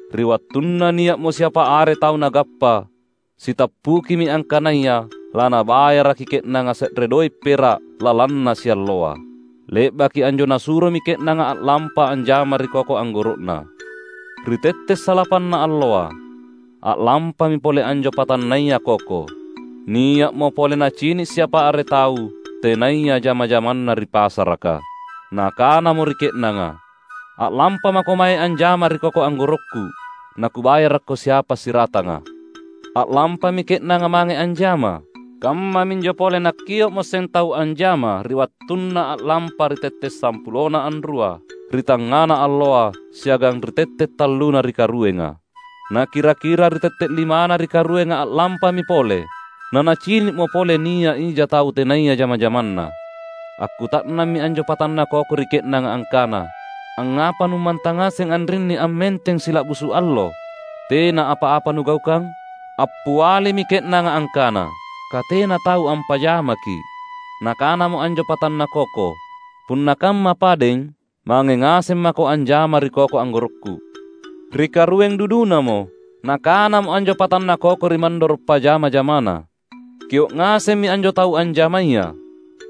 Ri wattunna nia’mo siapa are tau nagappa, sitappukimi angkanaya lanabayaraki ke’nanga se’re doe’ pera’ lalanna sialloa. Le’baki anjo nasuromi ke’nanga a’lampa anjama ri koko anggoro’na. Ri tette’ salapanna alloa, a’lampami pole anjo patannaya koko. Nia’mo pole nacini’ siapa are tau, tenaya jama-jamanna ri pasaraka. Nakanamo ri ke’nanga, ‘A’lampamako mange anjama ri koko anggorokku, nakubayarakko siapa siratanga.’ A’lampami ke’nanga mange anjama. Kammaminjo pole nakkio’moseng tau anjama ri wattunna a’lampa ri tette’ sampulona anrua ri tangngana alloa siagang ri tette’ talluna ri karuenga. Nakira-kira ri tette’ limana ri karuenga a’lampami pole. Nanacini’mo pole nia’ ija tau tenaya jama-jamanna. Akkuta’nammi anjo patanna koko ri ke’nanga angkana, ‘Angngapa nummantang ngaseng anrinni ammenteng sila’busu’ allo tena apa-apa nugaukang?’ Appialimi ke’nanga angkana, ‘Katena tau ampajamaki’.’ Nakanamo anjo patanna koko, ‘Punna kamma padeng, mange ngaseng mako anjama ri koko anggorokku.’ Ri karueng dudunamo, nakanamo anjo patanna koko ri mandoro’ pajama-jamana, ‘Kio’ ngasemmi anjo tau anjamaya.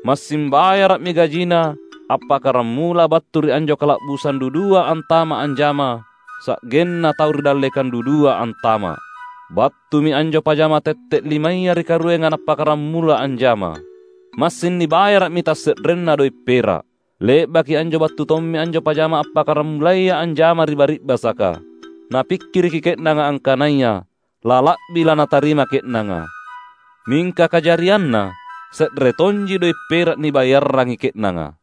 Massing bayara’mi gajina appakkaramula battu ri anjo kala’busang dudua antama’ anjama sa’genna tau ri dallekang dudua antama’.’ Battumi anjo pajama tette’ limaya ri karuenga nappakkaramula anjama. Massing nibayara’mi tasse’renna doe’ pera’. Le’baki anjo battu tommi anjo pajama appakkaramulaya anjama ri bari’basaka. Napikkiriki ke’nanga angkanaya lala’bi lanatarima ke’nanga. Mingka kajarianna se’re tonji doe’ pera’ nibayarrangi ke’nanga.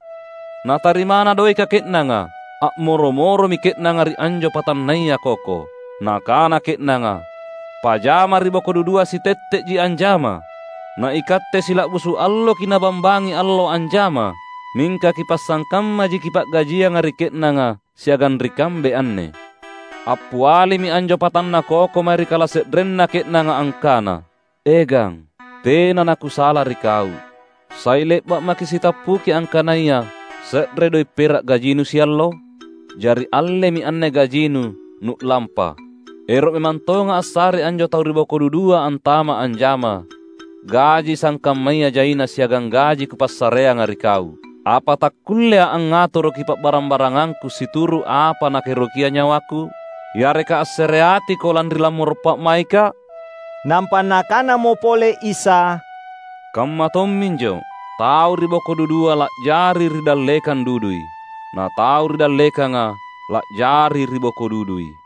Natarimana doeka ke’nanga, a’moro-moromi ke’nanga ri anjo patannaya koko. Nakana ke’nanga, ‘Pajama ri boko dudua sitette’ji anjama. Na ikatte sila’busu’ alloki’ nabambangi allo anjama, mingka kipasangkammaji kipa’gajianga ri ke’nanga siagang ri kambe anne!’ Appialimi anjo patanna koko mae ri kalase’renna ke’nanga, angkana, ‘E gang, tena nakusala ri kau. Sai le’ba’ maki’ sitappuki angkanaya se’re doe’ pera’ gajinu siallo? Jari, allemi anne gajinu, nu’lampa. Ero’ memang tonga’ assarei anjo tau ri boko dudua antama’ anjama, gaji sangkammaya jaina siagang gaji kupassareanga ri kau. Apa takkullea’ angngatoroki pa’barang-barangangku situru’ apa nakaerokia nyawaku? Yareka assereatiko lanri lammoro’ pa’maikka’?’" Nampa Nakanamo pole Isa, "Kamma tomminjo, tau ri boko dudua la’jari ri dallekang dudui, na tau ri dallekanga la’jari ri boko dudui."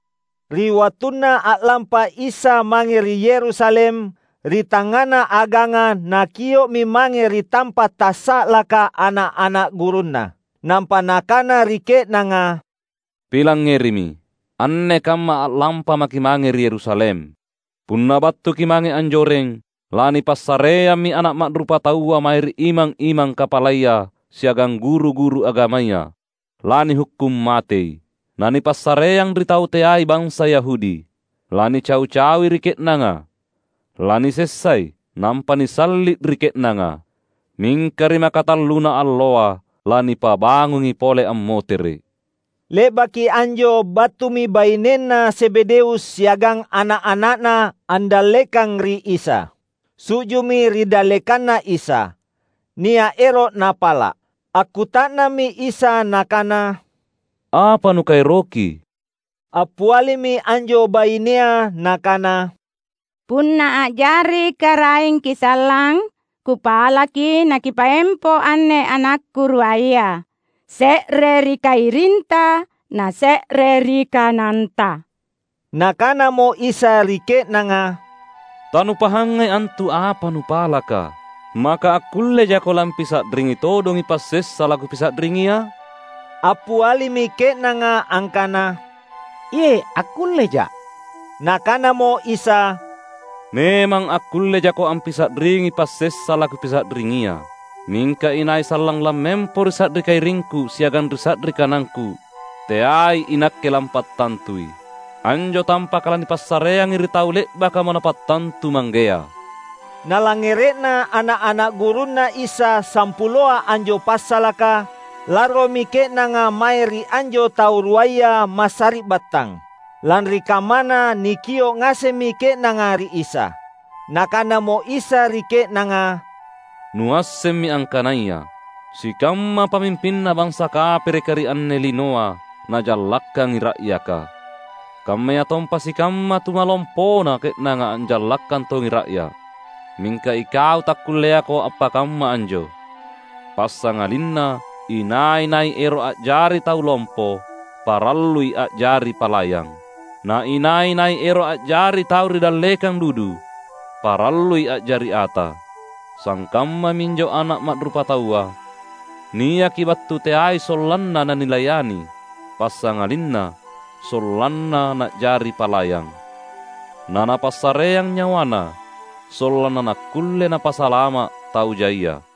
Ri wattunna a’lampa Isa mange ri Yerusalem, ri tangngana aganga Nakio’mi mange ri tampa’ tassa’laka ana’-ana’ gurunNa. Nampa Nakana ri ke’nanga, "Pilangngerimi! Anne kamma a’lampa maki’ mange ri Yerusalem. Punna battuki’ mange anjoreng, lanipassareammi Ana’ Ma’rupataua mae ri imang-imang kapalaya siagang guru-guru agamaya. Lanihukkung matei, nanipassareang ri tau teai bansa Yahudi. Lanicau-caui ri ke’nanga, lanisessai, nampa nisalli’ ri ke’nanga. Mingka ri makatalluna alloa lanipabangungi pole ammotere’." Le’baki anjo battumi bainenna Zebedeus siagang ana’-ana’na andallekang ri Isa. Su’ju’mi ri dallekanNa Isa. Nia’ ero’ napala’. Akkuta’nammi Isa Nakana, "Apa nukaeroki?" Appialimi anjo bainea nakana, "Punna a’jari KaraengKi’ sallang kupalaki naKipaempo anne anakku ruaya, se’re ri kairinTa na se’re ri kananTa." Nakanamo Isa ri ke’nanga, "Tanupahangai antu apa nupalaka. Maka akkullejako lampisa’ringi todongi passessa laKupisa’ringia?" Appialimi ke’nanga angkana, "Iye’, akkulleja’." Nakanamo Isa, "Memang akkullejako ampisa’ringi passessa laKupisa’ringia. Mingka inai sallang lammempo ri sa’ri kairingKu siagang ri sa’ri kanangKu, teai iNakke lampattantui. Anjo tampaka lanipassareangi ri tau le’bakamo Napattantu Manggea." Nalangngere’na ana’-ana’ gurunNa Isa sampuloa anjo passalaka, larromi ke’nanga mae ri anjo tau ruaya massari’battang. Lanri kammana nikio’ ngasemmi ke’nanga ri Isa. Nakanamo Isa ri ke’nanga, "Nuassemmi angkanaya sikamma pamimpinna bansa kapereka ri anne linoa najallakkangi ra’yaka. Kammayatompa sikamma tumalompona ke’nanga anjallakkang tongi ra’ya’. Mingka ikau takkulleako appakamma anjo. Passangalinna inai-nai ero’ a’jari tau lompo parallui a’jari palayang. Na inai-nai ero’ a’jari tau ri dallekang dudu, parallui a’jari ata. Sangkamma minjo Ana’ Ma’rupataua; niaki battu teai sollanna nanilayani, passangalinna sollanna na’jari palayang. NaNapassareang nyawaNa, sollanna nakkulle Napasalama’ tau jaia."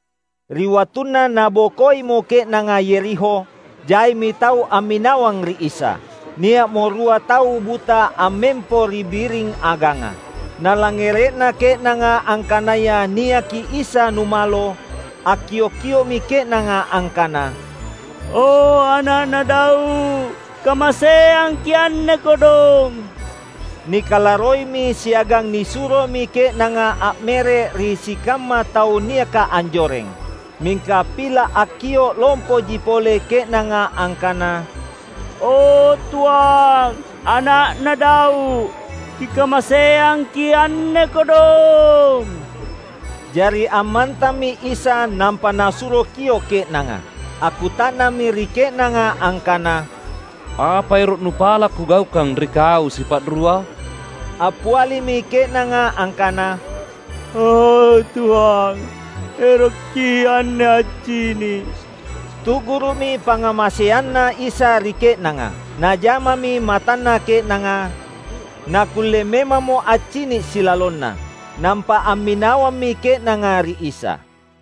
Ri wattunna nabokoimo ke’nanga Yerikho, jaimi tau amminawang ri Isa. Nia’mo rua tau buta ammempo ri biring aganga. Nalangngere’na ke’nanga angkanaya niaki Isa numalo, akkiok-kio’mi ke’nanga angkana, "O Ana’na Daud, kamaseangki’ anne kodong!" Nikalarroimi siagang nisuromi ke’nanga a’mere’ ri sikamma tau niaka anjoreng. Mingka pila’ akkio’ lompoji pole ke’nanga angkana, "O Tuang, Ana’na Daud, Kikamaseangki’ anne kodong!" Jari ammantammi Isa nampa Nasuro kio’ ke’nanga. Akkuta’nammi ri ke’nanga angkana, "Apa ero’ nupala’ Kugaukang ri kau sipa’rua?" Appialimi ke’nanga angkana, "O Tuang, erokki’ anne accini’!" Tu’guru’mi pangngamaseanNa Isa ri ke’nanga. Najamami matanna ke’nanga, nakkulle memammo accini’ silalonna. Nampa amminawammi ke’nanga ri Isa.